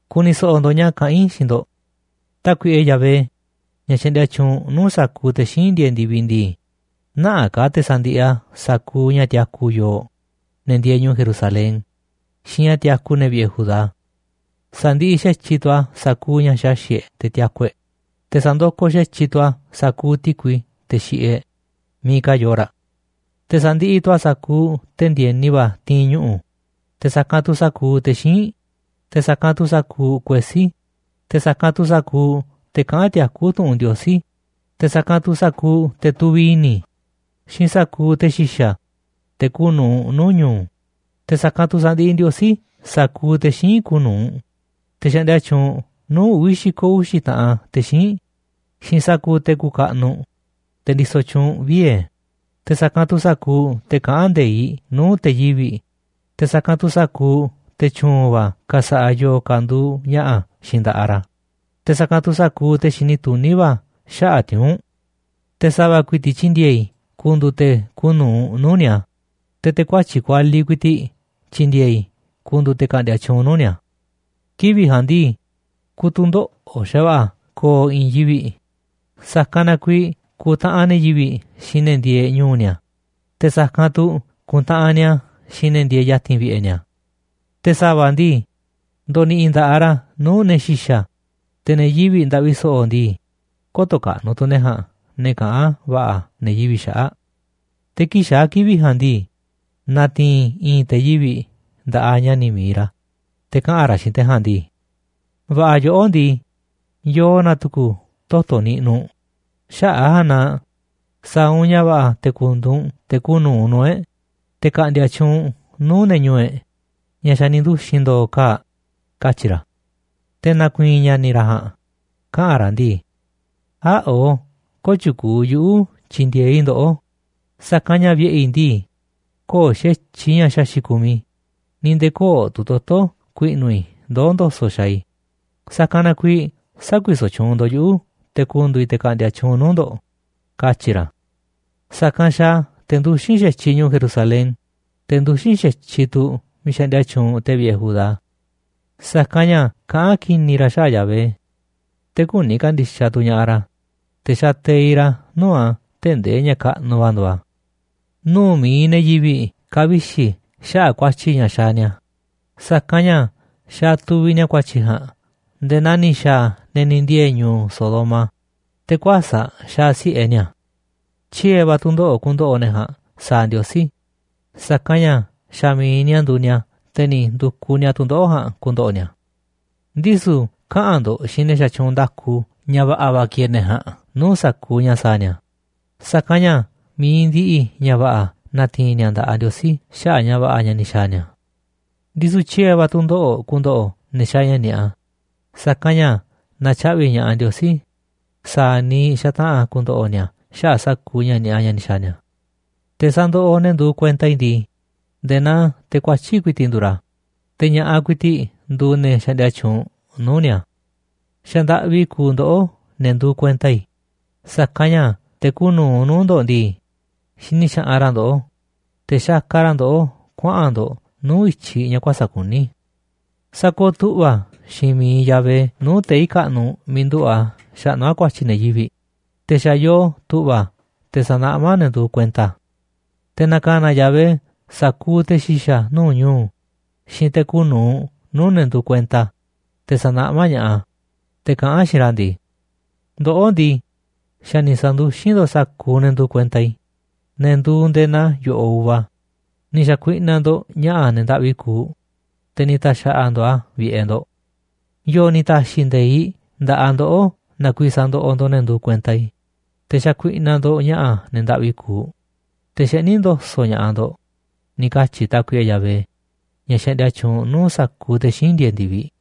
Ku̱ni̱ so̱ꞌo̱ ndo̱ꞌ ña̱ kaꞌán i̱ xiinꞌ ndo̱ꞌ. Tákuiꞌe Yahvé, ña̱ xaꞌndia tyuunꞌ nuu̱ꞌ sa̱kuuꞌ te̱ xíinꞌ ndieeꞌ ndi̱viꞌ ndii, nä̱ꞌaꞌ ka̱ te̱ sa̱ndiꞌiꞌ a̱ sa̱kuuꞌ ña̱ tiaku yooꞌ, ne̱ ndieeꞌ ñu̱u̱ Jerusalén xiinꞌ ña̱ tiaku ne̱ vi̱ꞌe̱ Judá. Sa̱ndiꞌiꞌ xa̱tyiꞌ tu̱ a̱ sa̱kuuꞌ ña̱ xaxi̱ꞌ e̱ꞌ te̱ tiaku e̱ꞌ, te̱ sa̱ndokoꞌ xa̱tyiꞌ tu̱ a̱ sa̱kuuꞌ ti̱kui teꞌ xiꞌiꞌ e̱ꞌ miiꞌ ka̱ yooꞌ raꞌ. Te̱ sa̱ndiꞌiꞌ tu̱ a̱ sa̱kuuꞌ te̱ ndi̱e̱ni va̱ ti̱i̱n ñuꞌu̱, te̱ sa̱kanꞌ tu̱ sa̱kuuꞌ te̱ xíinꞌ, te̱ sa̱kanꞌ tu̱ sa̱kuuꞌ kuesí, te̱ sa̱kanꞌ tu̱ sa̱kuuꞌ te̱ kaꞌán tiakú tu̱ꞌu̱n Ndiosí, te̱ sa̱kanꞌ tu̱ sa̱kuuꞌ te̱ tuviꞌ i̱ni̱ xiinꞌ sa̱kuuꞌ te̱ xi̱xa̱, te̱ kuuꞌ nu̱uꞌ nuu̱ꞌ ñu̱u̱. Te̱ sa̱kanꞌ tu̱ sa̱ndiꞌiꞌ Ndiosí sa̱kuuꞌ te̱ xíinꞌ kuuꞌ nu̱uꞌ, te̱ xaꞌndia tyuunꞌ nuu̱ꞌ uvi̱ xi̱ko̱ uxi̱ taꞌan te̱ xíinꞌ xiinꞌ sa̱kuuꞌ te̱ kuuꞌ kaꞌnuꞌ, te̱ ndisoꞌ tyuunꞌ vie̱, te̱ sa̱kanꞌ tu̱ sa̱kuuꞌ te̱ kaꞌán nde̱iꞌ nuu̱ꞌ te̱ yivi̱ꞌ, te̱ sa̱kanꞌ tu̱ sa̱kuuꞌ te̱ tyu̱u̱n va̱ ka̱sa̱ꞌa̱ yo̱o̱ ka̱ nduuꞌ ña̱ꞌa̱ xiinꞌ nda̱ꞌaꞌ ra̱, te̱ sa̱kanꞌ tu̱ sa̱kuuꞌ te̱ xini tuní va̱ xaꞌa̱ꞌ tiuu̱nꞌ. Te̱ sa̱va̱ ku̱i̱ti̱ꞌ tyi̱ndi̱e̱e̱ i̱ ku̱ndu̱u̱ te̱ kuuꞌ nu̱uꞌ nuu̱ꞌ ni̱a̱, te̱ te̱ kuatyi̱ꞌ kualiꞌ ku̱i̱ti̱ꞌ tyi̱ndi̱e̱e̱ i̱ ku̱ndu̱u̱ te̱ ka̱ꞌndi̱a̱ tyuunꞌ nuu̱ꞌ ni̱a̱. Kivi̱ꞌ ja̱a̱nꞌ ndii, ku̱tu̱ndoꞌo̱ꞌ xa̱va̱ꞌa̱ ko̱o̱ i̱i̱n yivi̱ꞌ, sa̱kanꞌ na kuiiꞌ ku̱ntaꞌanꞌ ne̱ yivi̱ꞌ xiinꞌ ne̱ ndieeꞌ ñu̱u̱ ni̱a̱, te̱ sa̱kanꞌ tu̱ ku̱ntaꞌanꞌ ni̱a̱ xiinꞌ ne̱ ndieeꞌ ya̱ti̱n vi̱ꞌe̱ ni̱a̱. Te̱ sa̱va̱ ndii, ndo̱ni̱ꞌi̱ nda̱ꞌaꞌ ra̱ nuu̱ꞌ ne̱ xi̱xa̱, te̱ ne̱ yivi̱ꞌ ndaꞌvi so̱ꞌo̱ ndii, kö̱to̱ kaꞌnuꞌ tu̱ ne̱ ja̱a̱nꞌ ne̱ kaꞌán va̱ꞌa̱ ne̱ yivi̱ꞌ xaꞌa̱ꞌ. Te̱ kii̱ꞌ xaa̱ kivi̱ꞌ ja̱a̱nꞌ ndii, na̱ti̱i̱n i̱i̱n te̱ yivi̱ꞌ nda̱ꞌaꞌ ña̱ni̱ mi̱iꞌ ra̱, te̱ kaꞌa̱n ra̱ xiinꞌ te̱ ja̱a̱nꞌ ndii: “Va̱ꞌa̱ yoꞌó ndii, yoo na̱ tu̱ku̱ toto̱ niꞌnuꞌ u̱nꞌ, xaꞌa̱ꞌ a̱ ja̱a̱nꞌ na sa̱a̱ u̱nꞌ ña̱ va̱ꞌa̱ te̱ ku̱ndu̱u̱ u̱nꞌ te̱ kuuꞌ nu̱uꞌ nuu̱ꞌ e̱ꞌ, te̱ ka̱ꞌndi̱a̱ tyuunꞌ nuu̱ꞌ ne̱ ñu̱u̱ e̱ꞌ ña̱ xa̱ ni̱ nduxi̱n ndo̱o̱ kaa̱ꞌ”, katyi̱ ra̱. Te̱ na̱ku̱i̱i̱n ña̱ni̱ ra̱ ja̱a̱nꞌ kaꞌa̱n ra̱ ndii: “Äa̱ꞌo, köo̱ꞌ tyukuuꞌ yuꞌu̱ tyi̱ndi̱e̱eꞌ i̱ ndoꞌó, sa̱kanꞌ ña̱ vi̱ꞌe̱ i̱ ndii, köo̱ꞌ xa̱tyiꞌ ña̱ xaxi̱ꞌ kumiꞌ i̱ ni̱ nde̱e̱ köo̱ꞌ tu̱ toto̱ ku̱i̱ꞌnu̱ i̱ ndoó ndo̱so̱ꞌ xaaꞌ i̱, sa̱kanꞌ na kuiiꞌ sä̱kuisoꞌ tyuunꞌ ndo̱ꞌ yuꞌu̱ te̱ ku̱ndu̱u̱ i̱ te̱ ka̱ꞌndi̱a̱ tyuunꞌ nuu̱ꞌ ndo̱ꞌ”, katyi̱ ra̱. Sa̱kanꞌ xaaꞌ a̱ te̱ nduxín xa̱tyiꞌ ñu̱u̱ Jerusalén, te̱ nduxín xa̱tyiꞌ tu̱ miiꞌ xaꞌndia tyuunꞌ te̱ vi̱ꞌe̱ Judá. Sa̱kanꞌ ña̱ kaꞌán ki̱ni̱ ra̱ xaꞌa̱ꞌ Yahvé, te̱ küni ka̱ndi̱xaꞌ tu̱ ña̱ꞌaꞌ ra̱, te̱ xateiꞌ ra̱ nuu̱ꞌ a̱ tee̱ꞌ ndee ña̱ kaꞌnuꞌ va̱ nduuꞌ a̱. Nuu̱ꞌ mi̱iꞌ ne̱ yivi̱ꞌ ka̱vixi̱ ña̱ꞌaꞌ xaꞌa̱ꞌ ku̱a̱tyi̱ ña̱ xaaꞌ ni̱a̱, sa̱kanꞌ ña̱ xaaꞌ tuviꞌ ni̱a̱ ku̱a̱tyi̱ ja̱a̱nꞌ nde̱e̱ naa ni̱ xa̱a̱ ne̱ ni̱ ndiee̱ ñu̱u̱ Sodoma, te̱ kuäsa̱ꞌ xaaꞌ si̱ꞌe ni̱a̱ a̱. Tyiee̱ va̱ tu̱ndoꞌo̱ꞌ ku̱ndo̱ꞌo̱ ne̱ ja̱a̱nꞌ sa̱a̱ Ndiosí, sa̱kanꞌ ña̱ xa̱ mi̱iꞌ ni̱a̱ nduuꞌ ni̱a̱ te̱ ni̱ ndu̱kuꞌ ni̱a̱ tu̱ndoꞌo̱ꞌ ja̱a̱nꞌ ku̱ndo̱ꞌo̱ ni̱a̱. Ndisu̱ kaꞌa̱n ndo̱ꞌ xiinꞌ ne̱ xatyuunꞌ nda̱ku ña̱ va̱ꞌa̱ va̱ ki̱e̱e̱ ne̱ ja̱a̱nꞌ nuu̱ꞌ sa̱kuuꞌ ña̱ sa̱a̱ ni̱a̱, sa̱kanꞌ ña̱ mi̱iꞌ ndiꞌiꞌ ña̱ va̱ꞌa̱ na̱ti̱i̱n ni̱a̱ nda̱ꞌaꞌ Ndiosí xaꞌa̱ꞌ ña̱ va̱ꞌa̱ ña̱ ni̱ xa̱a̱ ni̱a̱. Ndisu̱ tyiee̱ va̱ tu̱ndoꞌo̱ꞌ ku̱ndo̱ꞌo̱ ne̱ xaaꞌ ña̱ ni̱a̱ꞌa, sa̱kanꞌ ña̱ na̱tyaꞌvi̱ ña̱ꞌaꞌ Ndiosí sa̱a̱ niiꞌ xataꞌa̱n ku̱ndo̱ꞌo̱ ni̱a̱ xaꞌa̱ꞌ sa̱kuuꞌ ña̱ ni̱a̱ꞌa ña̱ ni̱ xa̱a̱ ni̱a̱. Te̱ sandoꞌoꞌ ne̱ nduuꞌ kuenta i̱ ndii, nde̱e̱ naa te̱ kuatyi̱ꞌ ku̱i̱ti̱ꞌ nduuꞌ ra̱, te̱ ña̱ꞌaꞌ ku̱i̱ti̱ꞌ nduuꞌ ne̱ xaꞌndia tyuunꞌ nuu̱ꞌ ni̱a̱. Xa̱ ndaꞌvi kuuꞌ ndoꞌó ne̱ nduuꞌ kuenta i̱, sa̱kanꞌ ña̱ te̱ kuuꞌ nu̱uꞌ nuu̱ꞌ ndo̱ꞌ ndii, xini xaꞌanꞌ ra̱ ndoꞌó, te̱ xakaꞌ ra̱ ndoꞌó kuaꞌa̱n ndo̱ꞌ nuu̱ꞌ i̱tyiꞌ ña̱ kuäsa̱ꞌ kuní. Sakooꞌ tu̱ꞌva̱ xiinꞌ miiꞌ Yahvé nuu̱ꞌ tei̱ kaꞌnuꞌ miiꞌ nduꞌu̱ꞌ a̱ xaꞌnú a̱ ku̱a̱tyi̱ ne̱ yivi̱ꞌ, te̱ xa̱ yoo tu̱ꞌva̱ a̱ te̱ sa̱naꞌmá a̱ ne̱ nduuꞌ kuenta a̱. Te̱ na̱ka̱na̱ Yahvé sa̱kuuꞌ te̱ xi̱xa̱ nuu̱ꞌ ñu̱u̱ xiinꞌ te̱ kuuꞌ nu̱uꞌ nuu̱ꞌ ne̱ nduuꞌ kuenta a̱, te̱ sa̱naꞌmá ña̱ꞌaꞌ a̱, te̱ kaꞌán a̱ xiinꞌ ra̱ ndii: “Ndoꞌó ndii, xa̱ ni̱ sa̱nduxín ndo̱ꞌ sa̱kuuꞌ ne̱ nduuꞌ kuenta i̱, ne̱ nduuꞌ nde̱e̱ naa yo̱ꞌoꞌ uva, ni̱ xa̱kuinaꞌ ndo̱ꞌ ña̱ꞌa̱ ne̱ ndaꞌvi kuuꞌ, te̱ ni̱ ta̱xa̱ꞌa̱ ndo̱ꞌ a̱ vi̱ꞌe̱ ndo̱ꞌ. ¿Yo̱o̱ ni̱ ta̱xi̱ nde̱iꞌ nda̱ꞌaꞌ ndoꞌó na kuiiꞌ sandoꞌoꞌ ndo̱ꞌ ne̱ nduuꞌ kuenta i̱, te̱ xakuiꞌnaꞌ ndo̱ꞌ ña̱ꞌa̱ ne̱ ndaꞌvi kuuꞌ, te̱ xeꞌní ndo̱so̱ꞌ ña̱ꞌaꞌ ndo̱ꞌ?”, ni̱ katyi̱ Tákuiꞌe Yahvé, ña̱ xaꞌndia tyuunꞌ nuu̱ꞌ sa̱kuuꞌ te̱ xíinꞌ ndieeꞌ ndi̱viꞌ.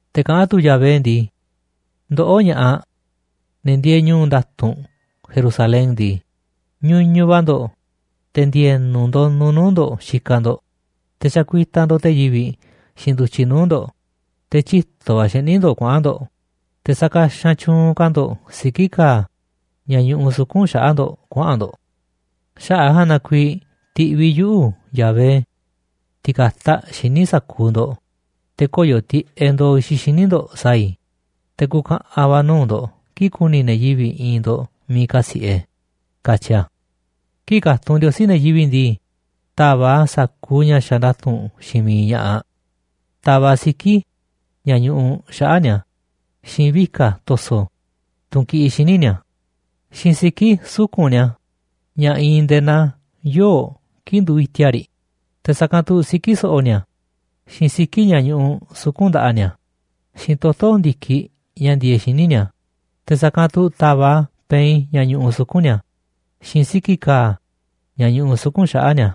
Te̱ kaꞌán tu̱ Yahvé ndii: “Ndoꞌó ña̱ꞌaꞌ, ne̱ ndieeꞌ ñu̱u̱ nda̱tu̱nꞌ Jerusalén ndii, ñuñuꞌ va̱ ndo̱ꞌ, te̱ ndi̱e̱nu̱ ndonuꞌ nuu̱ꞌ ndo̱ꞌ xikaꞌ ndo̱ꞌ, te̱ xakuitaꞌ ndo̱ꞌ te̱ yivi̱ꞌ xiinꞌ ndu̱tyiꞌ nuu̱ꞌ ndo̱ꞌ, te̱ tyito̱ va̱ xeꞌní ndo̱ꞌ kuaꞌa̱n ndo̱ꞌ, te̱ sakaxanꞌ tyu̱u̱n ka̱ ndo̱ꞌ siki̱ ka̱a̱ ña̱ ñuꞌuꞌ suku̱nꞌ xaꞌa̱ꞌ ndo̱ꞌ kuaꞌa̱n ndo̱ꞌ. Xaꞌa̱ꞌ a̱ ja̱a̱nꞌ na kuiiꞌ ti̱ꞌviꞌ yuꞌu̱, Yahvé, ti̱ka̱taꞌ xíniꞌ sa̱kuuꞌ ndo̱ꞌ, te̱ koyo̱ tiꞌeꞌ ndo̱o̱ i̱xiꞌ xíniꞌ ndo̱ꞌ sa̱a̱ i̱, te̱ ku̱ka̱ꞌa̱n va̱ nuu̱ꞌ ndo̱ꞌ kii̱ꞌ ku̱ni̱ ne̱ yivi̱ꞌ i̱i̱nꞌ ndo̱ꞌ miiꞌ kasi̱ꞌe”, katyi a̱. Kii̱ꞌ ka̱tunꞌ Ndiosí ne̱ yivi̱ꞌ ndii, ta̱va̱ꞌ a̱ sa̱kuuꞌ ña̱ xaaꞌ nda̱tu̱nꞌ xiinꞌ miiꞌ ña̱ꞌaꞌ ta̱va̱ꞌ a̱ siki̱ ña̱ ñuꞌuꞌ xaꞌa̱ꞌ ni̱a̱, xiinꞌ vika̱ to̱so̱, tunꞌ kiꞌiꞌ xíniꞌ ni̱a̱, xiinꞌ siki̱ suku̱nꞌ ni̱a̱ ña̱ iinꞌ nde̱e̱ naa yoo̱ꞌ kii̱ꞌ nduuꞌ iti̱a̱ꞌ riꞌ, te̱ sa̱kanꞌ tu̱ siki̱ so̱ꞌo̱ ni̱a̱, xiinꞌ siki̱ ña̱ ñuꞌuꞌ suku̱nꞌ nda̱ꞌaꞌ ni̱a̱, xiinꞌ toto̱ ndi̱kiꞌ ña̱ ndieeꞌ xíniꞌ ni̱a̱, te̱ sa̱kanꞌ tu̱ ta̱va̱ꞌ a̱ pein ña̱ ñuꞌuꞌ suku̱nꞌ ni̱a̱, xiinꞌ siki̱ ka̱a̱ ña̱ ñuꞌuꞌ suku̱nꞌ xaꞌa̱ꞌ ni̱a̱,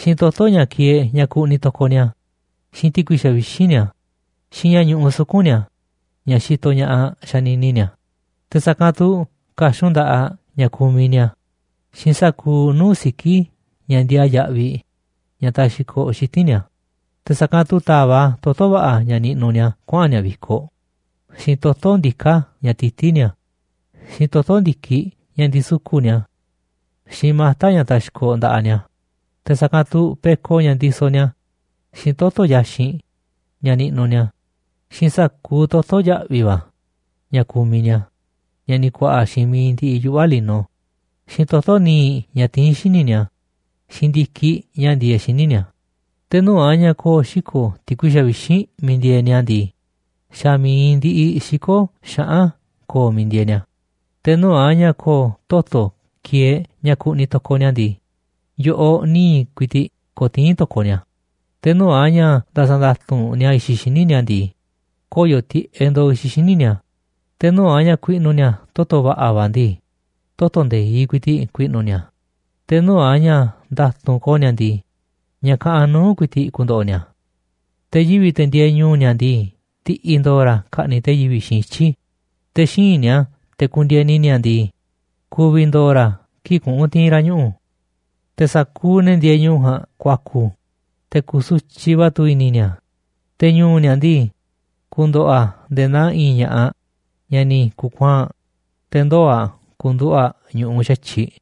xiinꞌ toto̱ ña̱ kieeꞌ ña̱ kuꞌniꞌ to̱koꞌ ni̱a̱, xiinꞌ ti̱kui xavixínꞌ ni̱a̱, xiinꞌ ña̱ ñuꞌuꞌ suku̱nꞌ ni̱a̱ ña̱ xitoꞌ ña̱ꞌaꞌ a̱ xanini ni̱a̱, te̱ sa̱kanꞌ tu̱ ka̱xun nda̱ꞌaꞌ ña̱ kumiꞌ ni̱a̱, xiinꞌ sa̱kuuꞌ nuu̱ꞌ siki̱ ña̱ ndiaa yaꞌviꞌ ña̱ taxkoꞌ xiti̱nꞌ ni̱a̱, te̱ sa̱kanꞌ tu̱ ta̱va̱ꞌ a̱ toto̱ va̱ꞌa̱ ña̱ niꞌnuꞌ ni̱a̱ kuaꞌa̱n ni̱a̱ vi̱koꞌ, xiinꞌ toto̱ ndiká ña̱ tití ni̱a̱, xiinꞌ toto̱ ndi̱kiꞌ ña̱ ndisuku̱ꞌ ni̱a̱, xiinꞌ mata̱ ña̱ taxkoꞌ nda̱ꞌaꞌ ni̱a̱, te̱ sa̱kanꞌ tu̱ peko ña̱ ndisoꞌ ni̱a̱, xiinꞌ toto̱ yaxinꞌ ña̱ niꞌnuꞌ ni̱a̱, xiinꞌ sa̱kuuꞌ toto̱ ya̱ꞌvi̱ va̱ ña̱ kumiꞌ ni̱a̱ ña̱ ni̱ ku̱a̱ꞌa̱ xiinꞌ mi̱iꞌ ndiꞌiꞌ yuꞌva̱ lino, xiinꞌ toto̱ nii̱ꞌ ña̱ tiín xíniꞌ ni̱a̱, xiinꞌ ndi̱kiꞌ ña̱ ndieeꞌ xíniꞌ ni̱a̱. Te̱ nuu̱ꞌ a̱ ña̱ ko̱o̱ xiko̱ ti̱kui xavixínꞌ miiꞌ ndieeꞌ ni̱a̱ ndii, xa̱ mi̱iꞌ ndiꞌiꞌ xiko̱ xaꞌán ko̱o̱ miiꞌ ndieeꞌ ni̱a̱. Te̱ nuu̱ꞌ a̱ ña̱ ko̱o̱ toto̱ kieeꞌ ña̱ kuꞌniꞌ to̱koꞌ ni̱a̱ ndii, yo̱ꞌoꞌ nii̱ꞌ ku̱i̱ti̱ꞌ ko̱tii̱n to̱koꞌ ni̱a̱, te̱ nuu̱ꞌ a̱ ña̱ nda̱sa̱ nda̱tu̱nꞌ ni̱a̱ i̱xiꞌ xíniꞌ ni̱a̱ ndii, koyo̱ tiꞌeꞌ ndo̱o̱ i̱xiꞌ xíniꞌ ni̱a̱. Te̱ nuu̱ꞌ a̱ ña̱ ku̱i̱ꞌnu̱ ni̱a̱ toto̱ va̱ꞌa̱ va̱ ndii, toto̱ nde̱iꞌ ku̱i̱ti̱ꞌ ku̱i̱ꞌnu̱ ni̱a̱, te̱ nuu̱ꞌ a̱ ña̱ nda̱tu̱nꞌ ko̱o̱ ni̱a̱ ndii, ña̱ kaꞌanꞌ nuu̱ꞌ ku̱i̱ti̱ꞌ ku̱ndo̱ꞌo̱ ni̱a̱. Te̱ yivi̱ꞌ, te̱ ndieeꞌ ñu̱u̱ ni̱a̱ ndii, ndi̱ꞌi̱ ndo̱o̱ ra̱ ka̱ꞌni̱ꞌ te̱ yivi̱ꞌ xiinꞌ ityi̱ te̱ xíinꞌ ni̱a̱, te̱ kundieni ni̱a̱ ndii, ku̱vi̱ ndo̱o̱ ra̱ kii̱ꞌ kuꞌu̱n ti̱i̱n ra̱ ñuꞌu̱. Te̱ sa̱kuuꞌ ne̱ ndieeꞌ ñu̱u̱ ja̱a̱nꞌ ku̱a̱ku̱, te̱ ku̱su̱tyiꞌ va̱ tu̱ i̱ni̱ ni̱a̱, te̱ ñu̱u̱ ni̱a̱ ndii, ku̱ndo̱ꞌo̱ a̱ nde̱e̱ naa i̱i̱n ña̱ꞌaꞌ ñaꞌ ni̱ ku̱kuaa̱nꞌ, te̱ ndoo̱ aꞌ ka̱nduꞌu̱ꞌ a̱ ñu̱ꞌuꞌ xa̱tyiꞌ.